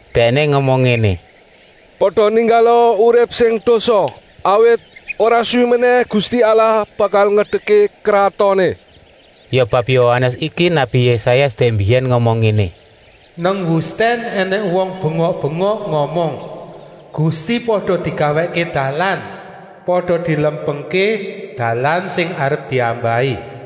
Dèkné ngomong ngéné: “Pada ninggala urip sing dosa, awit ora suwi menèh Gusti Allah bakal ngedekké kratoné.” Ya bab Yohanes iki nabi Yésaya dèk mbiyèn ngomong ngéné: “Nang wustèn ènèng wong bengok-bengok ngomong: ‘Gusti pada digawèkké dalan, pada dilempengké dalan sing arep diambahi.’”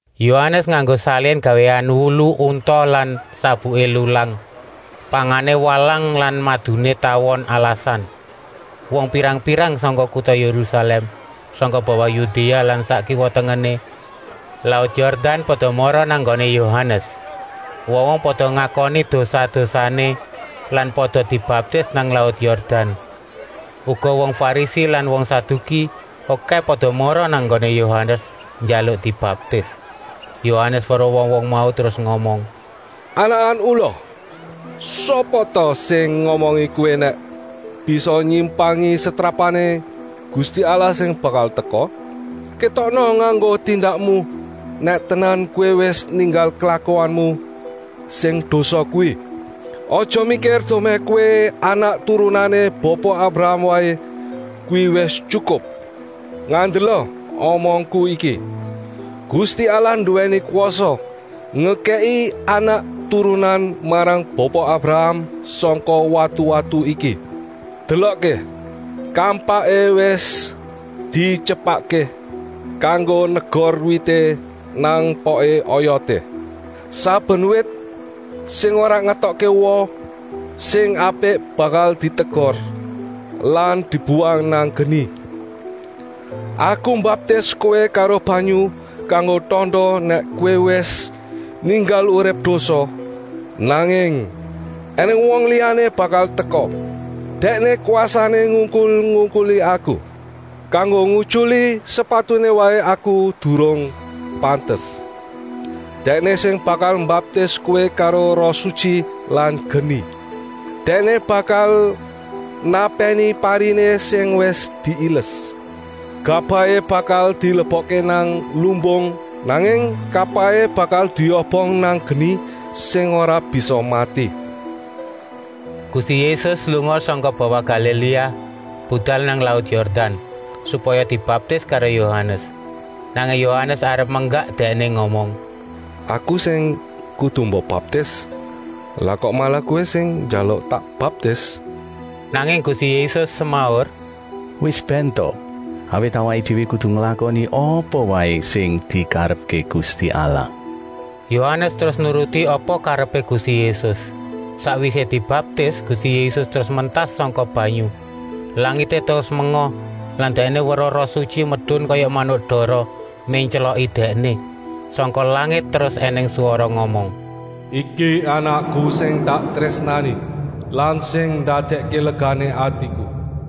Yohanes nganggo salin gawéan wulu unta lan sabuké lulang. Pangané walang lan maduné tawon alasan. Wong pirang-pirang sangka kuta Yérusalèm, sangka bawah Yudéa lan sak kiwa-tengené laut Yordan pada mara nang nggoné Yohanes. Wong-wong pada ngakoni dosa-dosané lan pada dibaptis nang laut Yordan. Uga wong Farisi lan wong Saduki okèh pada mara nang nggoné Yohanes njaluk dibaptis. Yohanes weruh wong-wong mau terus ngomong: “Anakan ula! Sapa ta sing ngomongi kowé nèk bisa nyimpangi setrapané Gusti Allah sing bakal teka? Kétokna nganggo tindakmu nèk tenan kowé wis ninggal klakuanmu sing dosa kuwi! Aja mikir dumèh kowé anak turunané Bapa Abraham waé, kuwi wis tyukup. Ngandela omongku iki: Gusti Allah nduwèni kwasa ngekèki anak-turunan marang Bapa Abraham sangka watu-watu iki. Delokké, kampaké wis dityepakké kanggo negor wité nang poké oyoté. Saben wit sing ora ngetokké woh sing apik bakal ditegor lan dibuwang nang geni. Aku mbaptis kowé karo banyu kanggo tanda nèk kowé wis ninggal urip dosa, nanging ènèng wong liyané bakal teka. Dèkné kwasané ngungkul-ungkuli aku. Kanggo ngutyuli sepatuné waé aku durung pantes. Dèkné sing bakal mbaptis kowé karo Roh Sutyi lan geni. Dèkné bakal napèni pariné sing wis diiles. Gabahé bakal dilebokké nang lumbung, nanging kapahé bakal diobong nang geni sing ora bisa mati.” Gusti Yésus lunga sangka bawah Galiléa, budal nang laut Yordan, supaya dibaptis karo Yohanes. Nanging Yohanes arep menggak Dèkné ngomong: “Aku sing kudu mbok baptis, lah kok malah Kowé sing njaluk tak baptis?” Nanging Gusti Yésus semaur: “Wis bèn ta, awit awaké déwé kudu nglakoni apa waé sing dikarepké Gusti Allah.” Yohanes terus nuruti apa karepé Gusti Yésus. Sakwisé dibaptis Gusti Yésus terus mentas sangka banyu. Langité terus menga lan Dèkné weruh Roh Sutyi medun kaya manuk dara, méntyloki Dèkné. Sangka langit terus ènèng swara ngomong: “Iki Anakku sing tak trésnani lan sing ndadèkké legané atiku.”